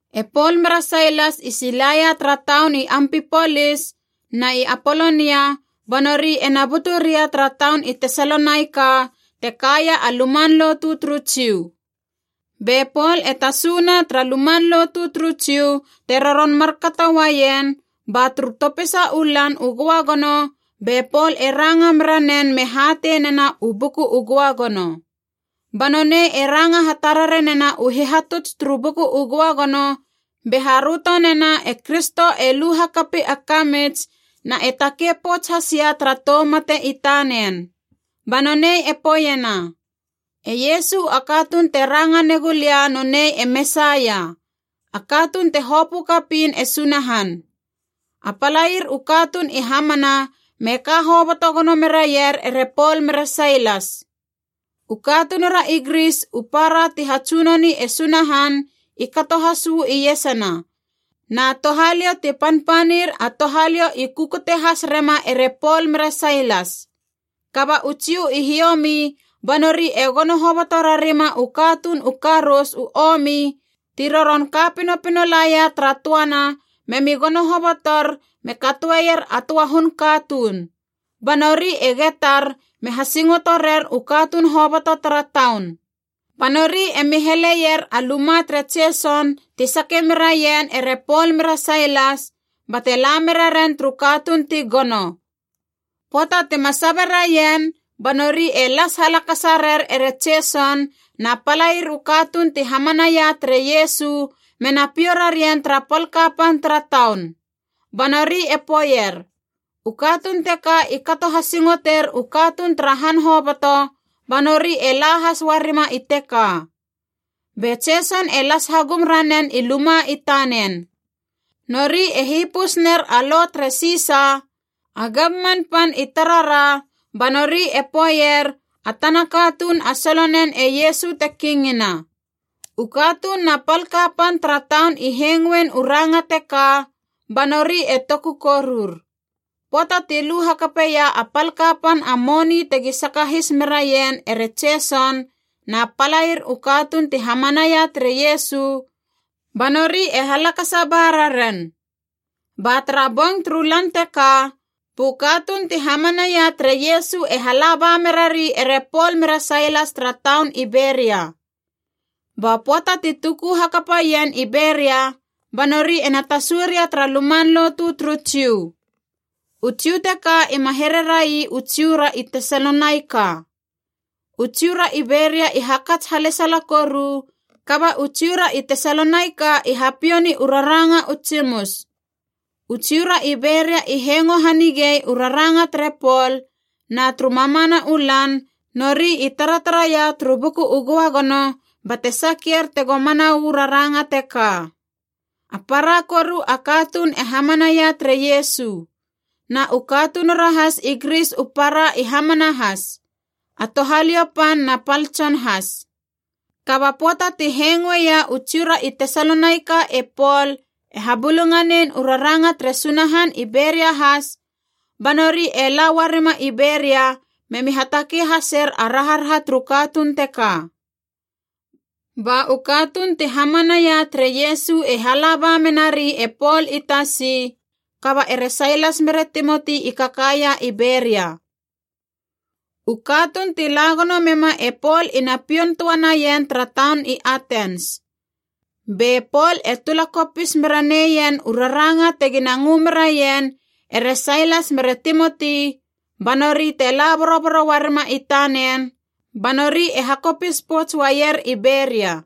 E Pol mere Sailas i silaia tara taun i Ampipolis na i Apolonia ba nori ena butu ria tara taun i Tesalonaika te kaia a luman lotu turu Jiu. Be Pol e tasu na tara luman lotu turu Jiu te roron markato uaien, ba turu topisa u Lan u Göagono be Pol e ranga mera nen me hatei nena u Buku u Göagono. Ba nonei e ranga hatarare nena u hihatuts turu Buku u Göagono be haröto nena e Kristo e lu hakapi a kamits na e takei pouts has ia tara tou mate i tanen. Ba nonei e poeiena, “E Iesu a katuun te ranga negu lia nonei a Mesaia, a katuun te hopö kapiin e Sunahan.” A palair u katuun i hamana me ka hoboto gono meraier ere Pol mere Sailas. U katunura i Gris u para ti hatsunoni e Sunahan i kato has uu iesana, na touhaliou ti panpanir a touhaliou i kukute has rema ere Pol mere Sailas. Kaba u Jiu i hiomi ba nori e gono hoboto rarima u katuun u karous u omi ti roron ka pinopino laia tara töana memi gono hobotor me katoeier a töa hun katuun, ba nori e getar me hasingoto rer u katuun hoboto tara taun. Ba nori emi heleier a luma tere Jeson ti sake meraien ere Pol mere Sailas bate la meraren turu katuun ti gono. Pöata tima sabe raien, ba nori e las halakasa rer e Jeson na palair u katuun ti hamanaia tere Iesu mena piou rarien tara pal kapan tara taun. Ba nori e poeier, “U katuun teka i kato hasingoter u katuun tara han hoboto, ba nori e la has uarima i teka. Be Jeson e las hagum ranen i luma i tanen. Nori e hipus ner a lo tere Sisa, a gamman pan i tarara, ba nori e poeier a tana katuun a solonen e Iesu te kingina.” U katuun na pal kapan tara taun i hengoein u ranga teka, ba nori e toku korur. Pöata ti lu hakapeia a pal kapan a moni tegi sakahis meraien ere Jeson na palair u katuun ti hamanaia tere Iesu, ba nori e halakasa ba rarien. Ba tara bong turu lan teka bu katuun ti hamanaia tere Iesu e hala ba merari ere Pol mere Sailas tara taun i Beria. Ba pöata ti tuku hakapa ien i Beria ba nori ena tasu ria tara luman lotu turu Jiu. U Jiu teka ima here rai u Jiu ra i Tesalonaika. U Jiu ra i Beria i hakats halesala koru, kaba u Jiu ra i Tesalonaika i hapiou ni u raranga u tsimus. U Jiu ra i Beria i hengo hanigei u raranga tere Pol, na turu mamana u lan nori i taratara ia turu Buku u Göagono bate sakier tego mana uu raranga teka. A para koru a katuun e hamanaia tere Iesu. Na u katunura has i Gris u para i hamana has, a touhaliou pan na pal tson has. Kaba pöata ti hengoeia u Jiu ra i Tesalonaika e Pol e habulunganein u raranga tere Sunahan i Beria has, ba nori e la uarima i Beria memi hatakei haser a raharaha turu katuun teka. Ba u katuun ti hamanaia tere Iesu e hala ba menari e Pol i tasi, kaba ere Sailas mere Timoti i kakaia i Beria. U katuun ti la gono mema e Pol ina pioun töa naien tara taun i Atens. Be Pol e tula kopis mera neien u raranga tegina ngö meraien ere Sailas mere Timoti ba nori te la boroboro uarima i tanen, ba nori e hakopis pouts uaier i Beria.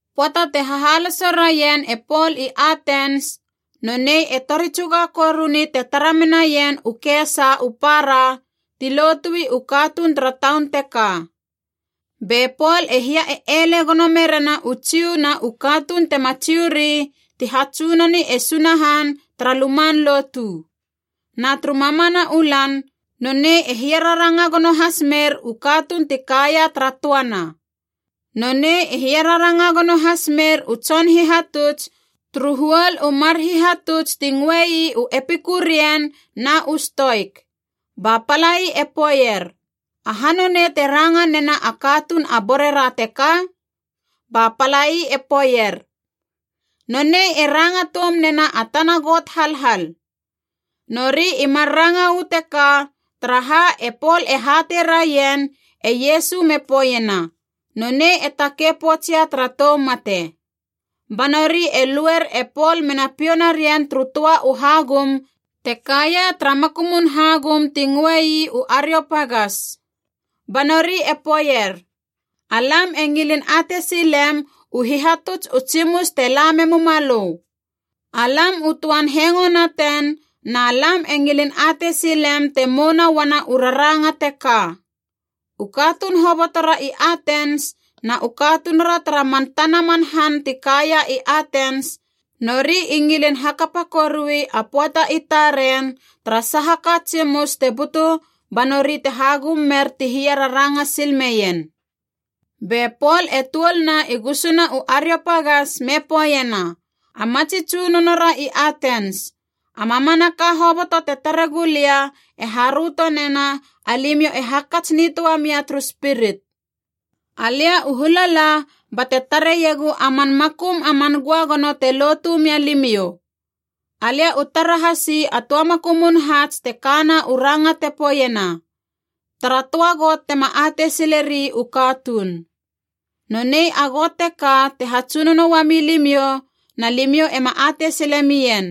Pöata te hahaloso raien e Pol i Atens, nonei e tori tsuga koruni te tara menaien u kesa u para ti lotui u katuun tara taun teka. Be Pol e hia e ele gono merena u Jiu na u katuun tema Jiu ri ti hatsunoni e Sunahan tara luman lotu. Na turu mamana u lan nonei e hiararanga gono has mer u katuun ti kaia tara töana. Nonei e hiararanga gono has mer u tson hihatuts turu huol u mar hihatuts ti ngöe ii u Epikurian na u Stoik. Ba palai e poeier, “Aha nonei te ranga nena a katuun a borera teka?” Ba palai e poeier, “Nonei e ranga toum nena a tana got halhal.” Nori i mar ranga uu teka, taraha e Pol e hatei raien e Iesu me poeiena nonei e takei poutsia tara tou mate. Ba nori e luer e Pol mena piou narien turu töa u hagum te kaia tara makumun hagum ti ngöei u Ariopagas. Ba nori e poeier, “Alam e ngilin atei silem u hihatuts u tsimus te la memuma lö. Alam u töan hengoe naten na lam e ngilin atei silem te mouna uana u raranga teka.” U katuun hobotora i Atens na u katunura tara man tana man han ti kaia i Atens, nori i ngilin hakapa koruei a pöata i taren tara saha ka tsimus te butu banori te hagum mer ti hia raranga sil meien. Be Pol e tuoluna i gusuna u Ariopagas me poeiena, “A matsi tsunonora i Atens, a mamanaka hoboto te tare gulia e haröto nena alimiou e hakats nitöa mia turu spirit. Alia u hula la bate tareiegu a man makum a man Göagono te lotu mia limiou. Alia u tara hasi a töa makumun haats te kana u ranga te poeiena: ‘Tara töa got tema atei sileri u katuun.’ Nonei a Got teka te hatsunono uami limiou na limiou ema atei sile mien,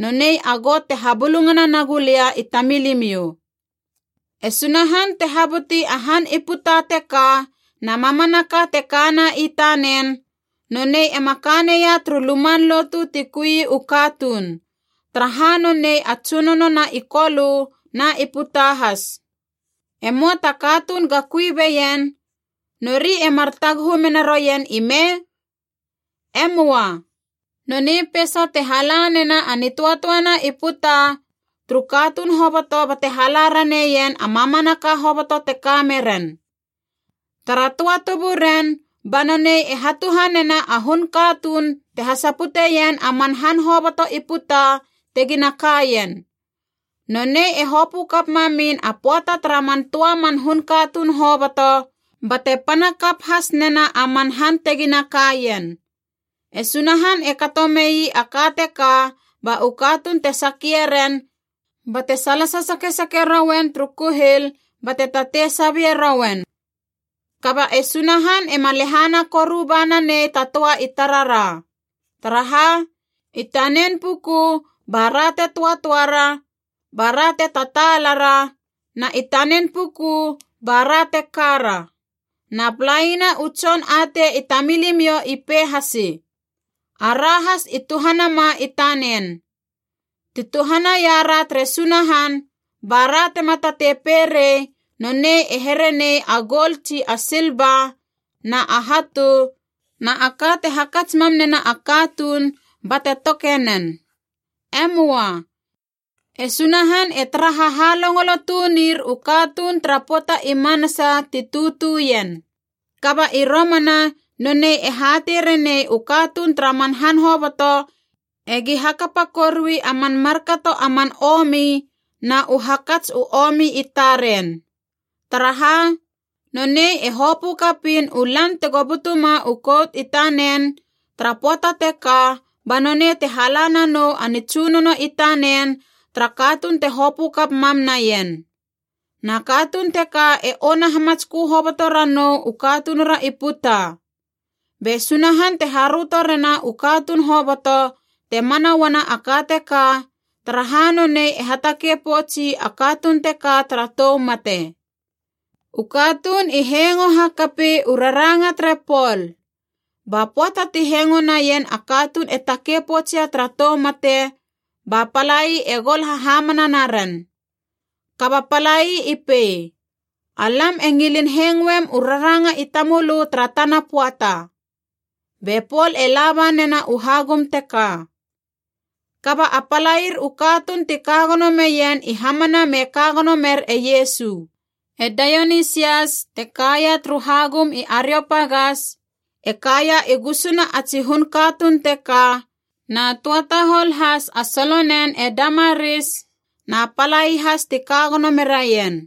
nonei a Got te habulungana nagu lia i tamilimiou. “E Sunahan te habuti a han i puta teka na mamanaka te kana i tanen, nonei ema ka neia turu luman lotu ti kui u katuun, taraha nonei a Tsunono na i Kolö na i puta has. E möa ta katuun ga kui beien, nori e mar taguhu mena roien ime? E möa. Nonei peisa te hala nena a nitöatöana i puta turu katuun hoboto bate hala raneien a mamanaka hoboto teka meren. Tara töa tuburen ba nonei e hatuhanena a hun katuun te hasaputeien a man han hoboto i puta tegina kaien. Nonei e hopö kap mamin a pöata tara man töa man hun katuun hoboto, bate pana kap has nena a man han tegina kaien. E Sunahan e kato mei a ka teka ba u katuun te sakie ren, bate salasa sakesake rouen turu kuhil bate tatei sabie rouen. Kaba e Sunahan ema lehana koru ba nanei ta töa i tarara. Taraha, i tanen puku bara te töatöara, bara te tataalara, na i tanen puku bara te kara. Na palaina u tson atei i tamilimiou i pei hasi, ‘Ara has i tuhanama i tanen.’ “Ti tuhanaia ra tere Sunahan, bara tema tatei pei rei nonei e here nei a goul tsi a silva na a hatu na a ka te hakats mam nena a katuun bate toke nen. E möa. E Sunahan e tara hahalongolo tunir u katuun tara pöata i manasa ti tutu ien. Kaba i romana nonei e hatei renei u katuun tara man han hoboto egi hakapa korui a man markato a man omi na u hakats u omi i taren. Taraha, nonei e hopö kapiin u lan tego butuma u kout i tanen, tara pöata teka ba nonei te hala nanou a nitsunono i tanen tara katuun te hopö kap mam naien. Na katuun teka e ona hamatskö hoboto ranou u katunura i puta. Be Sunahan te haröto rena u katuun hoboto te mana uana a ka teka, taraha nonei e hatakei poutsi a katuun teka tara tou mate.” U katuun i hengo hakapi u raranga tere Pol. Ba pöata ti hengo naien a katuun e takei poutsia tara tou mate, ba palai e gol hahamana naren. Kaba palai i pei, “Alam e ngilin hengoem u raranga i tamölö tara tana pöata.” Be Pol e laba nena u hagum teka. Kaba a palair u katuun ti ka gono meien i hamana me ka gono mer e Iesu. E Daionisias, te kaia turu hagum i Ariopagas, e kaia i gusuna a tsi hun katuun teka, na töa tahol has a solonen e Damaris, na palai has ti ka gono meraien.